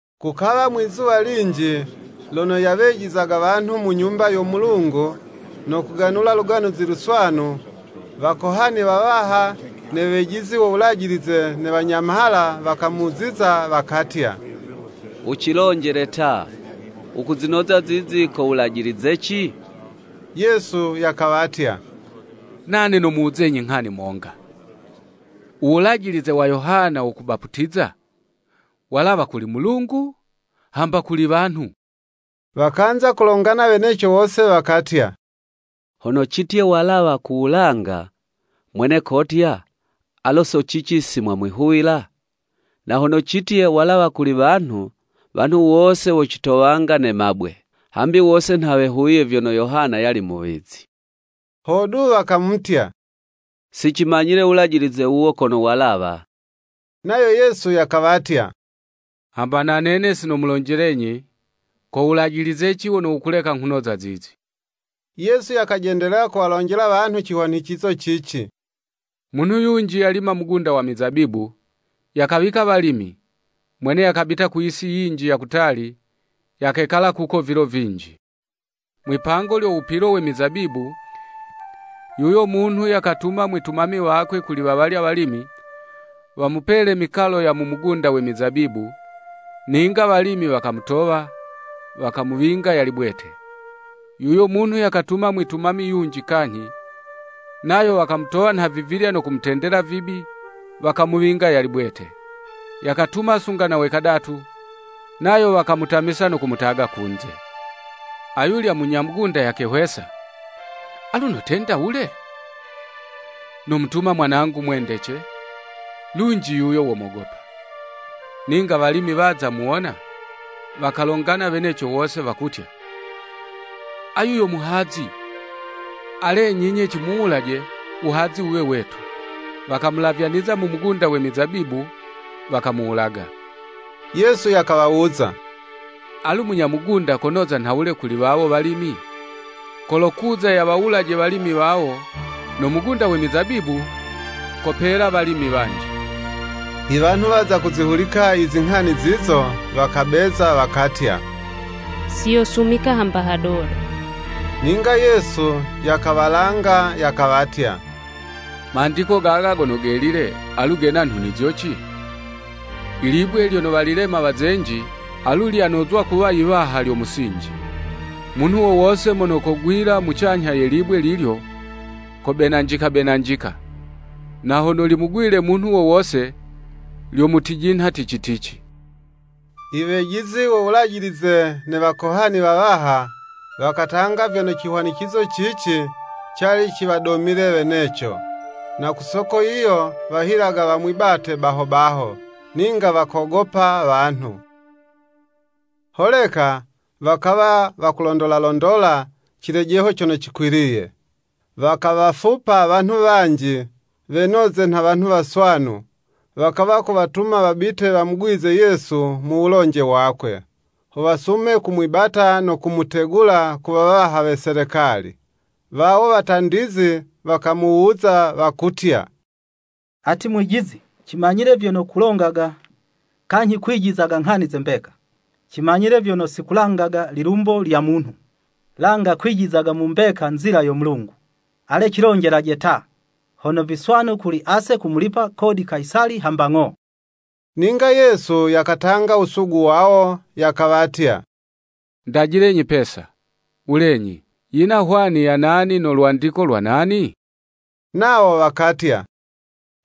Kukawa mwi'zuwa linji, lono yawejizaga wanhu mu Nyumba yo Mulungu, no kuganula Luganuzi Luswanu, Wakohani wawaha ne wejizi wo Wulajilize ne wanyamhala wakamuziza, wakatya, “Wucilonjele ta! Wukuzinoza zizi ko wulajilizeci?” Yesu yakawatya, “Nane nomuwuzenyi nghani monga, u wulajilize wa Yohana wo kubaputiza, walawa kuli Mulungu hamba kuli wanhu?” Wakanza kulongana weneco wose wakatya: “Hono citye walawa ku wulanga, mwene kotya, ‘Alo so cici si mwamwihuwila?’ Na hono citye, walawa kuli wanhu, wanhu wose wocitowanga ne mabwe, hambi wose nha wehuwiye vyono Yohana yali muwizi.” Hodu, wakamutya, “Sicimanyile wulajilize wuwo kono walawa.” Nayo Yesu yakawatya, “Hamba na nene si nomulonjelenyi, ko wulajilizeci wono wukuleka nghunoza zizi.” Yesu yakajendelela kuwalonjela wanhu cihwanicizo cici. “Munhu yunji yalima mugunda wa mizabibu, yakawika walimi, mwene yakabita ku yisi yinji ya kutali, yakekala kuko vilo vinji. Mwipango lyo wupilo we mizabibu, yuyo munhu yakatuma mwitumami wakwe kuli wawalya walimi, wamupele mikalo ya mu mugunda we mizabibu, ninga walimi wakamutowa, wakamuwinga yali bwete. Yuyo munhu yakatuma mwitumami yunji kanyhi; nayo wakamutowa nhavivilya no kumutendela vibi, wakamuwinga yali bwete. Yakatuma sunga na we kadatu; nayo wakamutamisa no kumutaga kunze.” Ayulya munya mugunda yakehwesa; “Alu notenda wule? Nomutuma mwanangu mwendece, lunji yuyo womogopa.” Ninga walimi waza muwona, wakalongana weneco wose, wakutya, “Ayu yo muhazi, alenyi 'nye cimuwulaje, wuhazi wuwe wetu.” Wakamulavyaniza mu mugunda we mizabibu, wakamuwulaga. Yesu yakawawuza, “Alu u munya mugunda konoza nhawule kuli wawo walimi? Kolokuza yawawulaje walimi wawo, no mugunda we mizabibu, kopela walimi wanji.” I wanhu waza kuzihulika i zinghani zizo, wakabeza wakatya, “Siyosumika hamba hadodo.” Ninga Yesu yakawalanga, yakawatya, “Mandiko gaga gono Gelile, alu gena nhunizo ci? ‘Ilibwe lyono walilema Wazenji, Alu lyonozwa kuwa yiwaha lyo musinji!’ Munhu wo wose mono kogwila mucanyha ye libwe lilyo, kobenanjika-benanjika, na hono limugwile munhu wo wose, lyomutijinha tici-tici.” I wejizi wo Wulajilize ne Wakohani wawaha, wakatanga vyono cihwanicizo cici, cali ciwadomile weneco, na ku soko yiyo, wahilaga wamwibate baho baho, ninga wakogopa wanhu. Holeka wakawa wakulondola-londola cilejeho cono cikwiliye. Wakawafupa wanhu wanji, wenoze nha wanhu waswanu, wakawa kuwatuma wabite wamugwizize Yesu mu wulonje wakwe, ho wasume kumwibata no kumutegula ku wawaha we Selekali. Wawo watandizi, wakamuwuza wakutya, “Ati Mwijizi, cimanyile vyono wukulonga kanyhi wukwijiza nghani ze mbeka; cimanyile vyono si kulangaga lilumbo lya munhu, langa kwijizaga mu mbeka nzila yo Mulungu. Ale cilonjelaje ta, hono viswanu kuli ase kumulipa kodi Kayisali, hamba ng'o?” Ninga Yesu yakatanga wusugu wawo, yakawatya, “Ndajilenyi pesa, wulenyi, yina hwani ya nani no lwandiko lwa nani?” Nawo wakatya,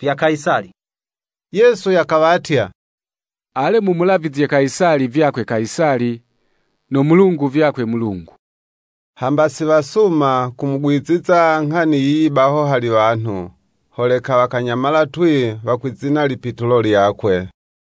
“Vya Kayisali.” Yesu yakawatya, “Ale mumulavizye Kayisali vyakwe Kayisali, no Mulungu vyakwe Mulungu.” Hamba si wasuma kumugwiziza nghani yiyi baho hali wanhu, holeka wakanyamala twii, wakwizina lipitulo lyakwe.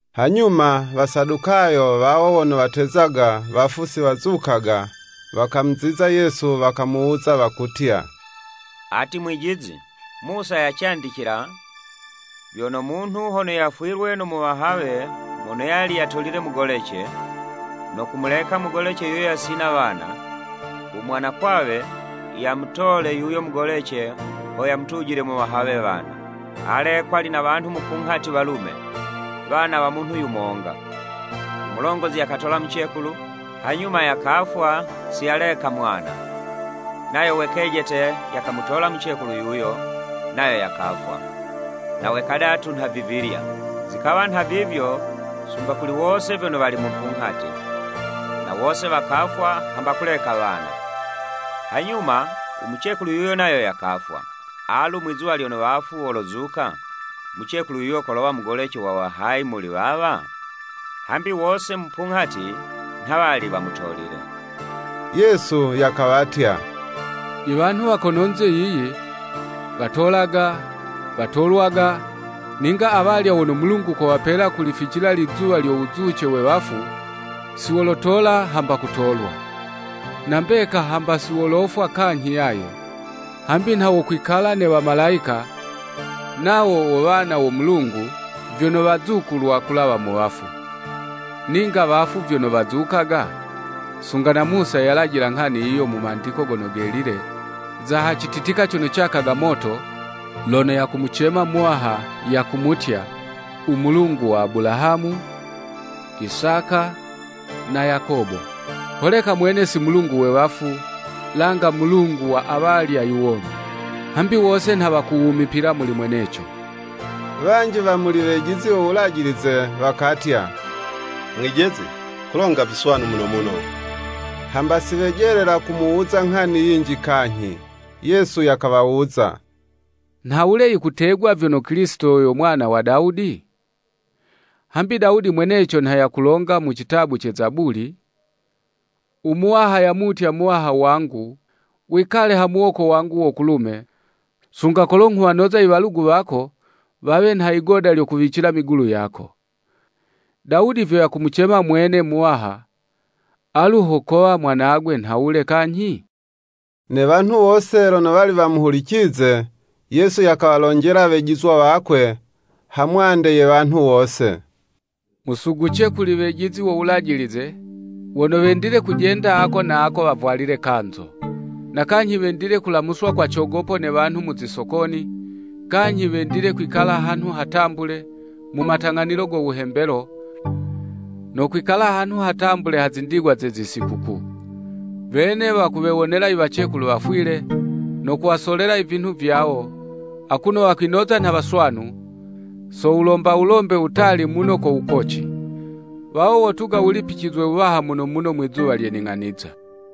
Hanyuma, Wasadukayo, wawo wono watezaga, wafu si wazukaga; wakamuziza Yesu wakamuwuza wakutya. “Ati Mwijizi, Musa yacandicila, vyono munhu hono yafwilwe no muwahawe mono yali yatolile mugolece, no kumuleka mugolece yuyo yasina wana, u mwanakwawe yamutole yuyo mugolece ho yamutujile muwahawe wana. Ale, kwali na wanhu mupunghati walume, wana wa munhu yumonga, u mulongozi yakatola mucekulu, hanyuma yakafwa si yaleka mwana. Nayo wekejete [yakamutola mucekulu yuyo, nayo yakafwa,] na we kadatu nhavivilya. Zikawa nha vivyo sunga kuli wose vyono wali mupunghati, na wose wakafwa hamba kuleka wana. Hanyuma u mucekulu yuyo nayo yakafwa. Alu mwizuwa lyono wafu wolozuka, mucekulu yuyu kolowa mugolece wa wahayi muli wawa? Hambi wose mupunghati nha wali wamutolile.” Yesu yakawatya, “I wanhu wa kononze yiyi, watolaga, watolwaga, ninga awalya wono Mulungu kowapela kulificila lizuwa lyo wuzuce we wafu, si wolotola hamba kutolwa. Na mbeka hamba si wolofwa kanyhi yaye, hambi nha wokwihwana ne wamalayika; nawo wo wana wo Mulungu, vyono wazukulwa kulawa mu wafu. Ninga wafu vyono wazukaga, sunga na Musa yayilajila nghani yiyo mu Mandiko gono Gelile, za ha cititika cono cakaga moto, lono yakumucema Muwaha, yakumutya, u Mulungu wa Abulahamu, Isaka na Yakobo. Holeka mwene si Mulungu we wafu, langa Mulungu wa awalya iwomi. Hambi wose nha wakuwumipila muli mweneco.” Wanji wa muli Wejizi wo Wulajilize wakatya, “Mwijizi, kulonga viswanu muno muno.” Hamba si wejelela kumuwuza nghani yinji kanyhi. Yesu yakawawuza, “Nhawule yikutegwa vyono Kilisito yo mwana wa Dawudi? Hambi Dawudi mweneco nha yakulonga mu citabu ce Zabuli, ‘U Muwaha yamutya Muwaha wangu Wikale ha muwoko wangu wo kulume, Sunga kolo nghuwanoza iwalugu wako wawe nha yigoda lyo kuwicila migulu yako.’ Dawudi vyo yakumucema mwene, ‘Muwaha,’ alu ho kawa mwanagwe nhawule kanyhi?” Ne wanhu wose lono wali wamuhulicize, Yesu yakawalonjela wejizwa wakwe, ha mwande ye wanhu wose, “Musuguce kuli wejizi wo Wulajilize wono wendile kujenda ako na ako wavwalile kanzo. Na kanyhi wendile kulamuswa kwa cogopo ne wanhu mu zisokoni, kanyhi wendile kwikala hanhu hatambule, mu matang'anilo go wuhembelo, no kwikala hanhu hatambule ha zindigwa ze zisikukuu. Wene wakuwewonela iwacekulu wafwile, no kuwasolela ivinhu vyawo, akuno wakwinoza nha waswanu, so wulomba wulombe wutali muno ko wukoci. Wawo wotuga wulipicizwe wuwaha muno muno mwizuwa lye ning'aniza.”